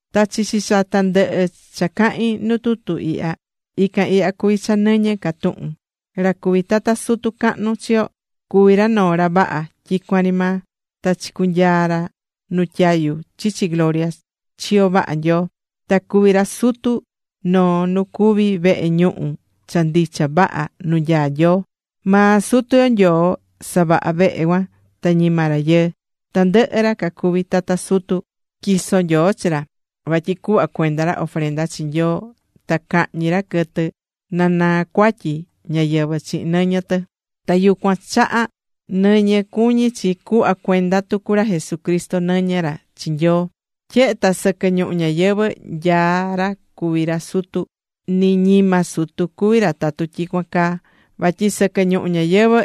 Ta chichi cha tandɨhɨ cha cahín nu tutu ihya, ican ihya cuví cha nɨñɨ ca tuhun: Ra cuví tata sutu cahnu chi yo cuví ra noo ra vaha tyicuan ri maa, ta chicunyaa̱ ra nu tyayu chichi gloria chiyo vaha Nyoo. Ta cuví ra Sutu noo nu cuví vehe ñuhu cha ndicha vaha nu nyaá Nyoo. Maa Sutu yo Nyoo savaha̱ vehe cuan, ta ñima rayɨɨ. Tandɨhɨ ra cacuví tata sutu tyiso̱ Nyoo chi ra, vatyi cuhva cuenda ra ofrenda chi Nyoo ta cahñi ra quɨtɨ na naa cuatyi ñáyɨvɨ chihin nɨñɨ tɨ. Ta yucuan chaha̱ nɨñɨ cuñí chi cuhva cuenda tucu ra Jesucristo nɨñɨ ra chi Nyoo. Tyehe ta sɨquɨ ñuhu ñayɨvɨ̱ nyaá ra cuví ra sutu, ni ñima sutu cuvi ra tatu tyicuan caa. Vatyi sɨquɨ ñuhu ñayɨvɨ̱,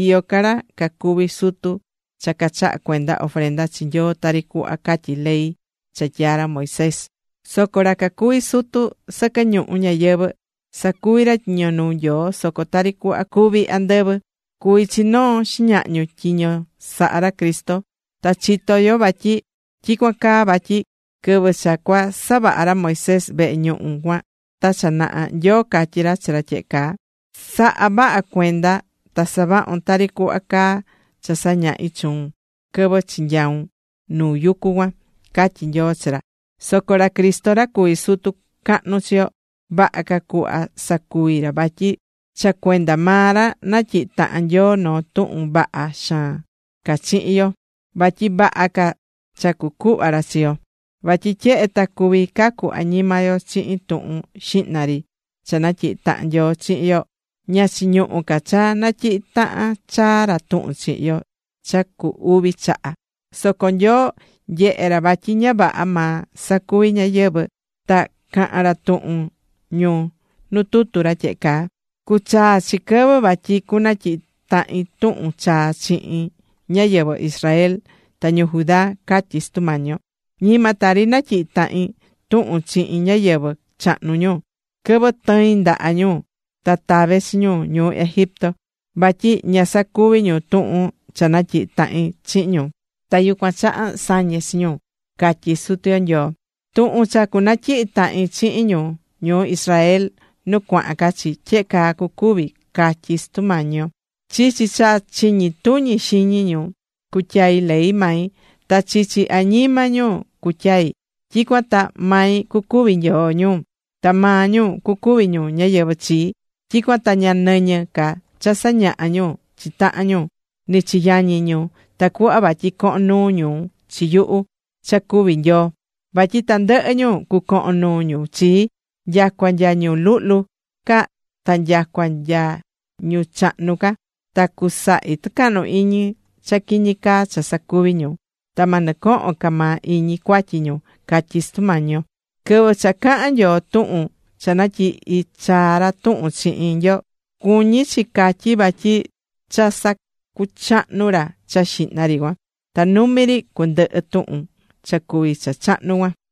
iyó ca ra cacuví sutu cha cachahá cuenda ofrenda chi Nyoo tari cuhva catyí ley cha tyaa̱ ra Moisés. Soco ra cacuví sutu sɨquɨ ñuhu ñayɨvɨ̱, sacuví ra tyiño nuu Nyoo soco tari cuhva cuví andɨvɨ. Cuví chi noo xiñahñu tyiño sahá ra Cristo. Ta chitó yo vatyi tyicuan caa, vatyi quɨvɨ cha cua savaha̱ ra Moisés vehe ñuhu cuan ta cha naha, Nyoo catyi̱ ra chi ra tyehe caa: “Sa̱ha vaha cuenda, ta sa̱vahun tari cuhva caá cha sañahi̱ chuun quɨvɨ chinyau̱n nu yucu cuan”, catyí Nyoo chi ra. Soco ra Cristo ra cuví sutu cahnu chi yo, vaha ca cuhva sacuví ra, vatyi cha cuenda maa ra, natyihi̱ tahan Nyoo noo tuhun vaha xaan ca chihin yo, vatyi vaha ca cha cucuhva ra chi yo. Vatyi tyehe ta cuví cacu añima yo chihin tuhun xihna ri cha natyihi̱ tahan Nyoo chihin yo, ña chiñuhú ca cha natyihi tahan chaa ra tuhun chihin yo cha cu uvi chaha. Soco Nyoo nyehe̱ ra vatyi ña vaha maa sacuvi̱ ñáyɨvɨ cuan, ta cahán ra tuhun ñu nu tutu ra tyehe caa: Cuchaa chi quɨvɨ vatyi cunatyihi tahin tuhun chaa chihin ñáyɨvɨ Israel ta ñu Judá, catyí Sutu Mañi yo. Ñima tari natyihi̱ tahin tuhun chihin ñáyɨvɨ chahnu ñu, quɨvɨ tɨi̱n ndaha ñu ta tave̱ chi ñu ñuu Egipto. Vatyi ña sacuvi̱ ñu tuhun cha natyihi̱ tahin chihin ñu, ta yucuan chaha sañe̱ chi ñu, catyí Sutu yo Nyoo. Tuhun cha cunatyihi tahin chihin ñu ñuu Israel nu cuahan ca chi, tyehe caa cucuvi, catyi Sutu Mañi yo: Chichi cha chiñi tuñi xiñi ñu, cutyai ley mai, ta chichi añima ñu cutyai. Tyicuan ta mai cucuvi Nyoo ñu, ta maa ñu cucuvi ñu ñáyɨvɨ chii. Tyicuan ta ña nɨñɨ ca cha sañahá ñu chi tahan ñu, ni chi yañi ñu, tacuhva vatyi cohon nuu ñu chi yuhu cha cuví Nyoo ñu. Vatyi tandɨhɨ ñu, cucohon nuu ñu chii, nyacua nya ñu luhlu ca ta nyacua nya ñu chahnu ca. Ta cusahi tɨcahnu iñi cha quiñi caa cha sacuvi̱ ñu. Ta ma nɨcohon ca maa iñi cuatyi ñu, catyí Sutu Mañi yo. Quɨvɨ cha cahán Nyoo tuhun cha natyihi̱ chaa ra tuhun chihin yo, cuñí chi catyí vatyi cha sacuchahnu̱ ra cha xihna ri cuan. Ta numi ri cundɨhɨ tuhun cha cuví cha chahnu cuan.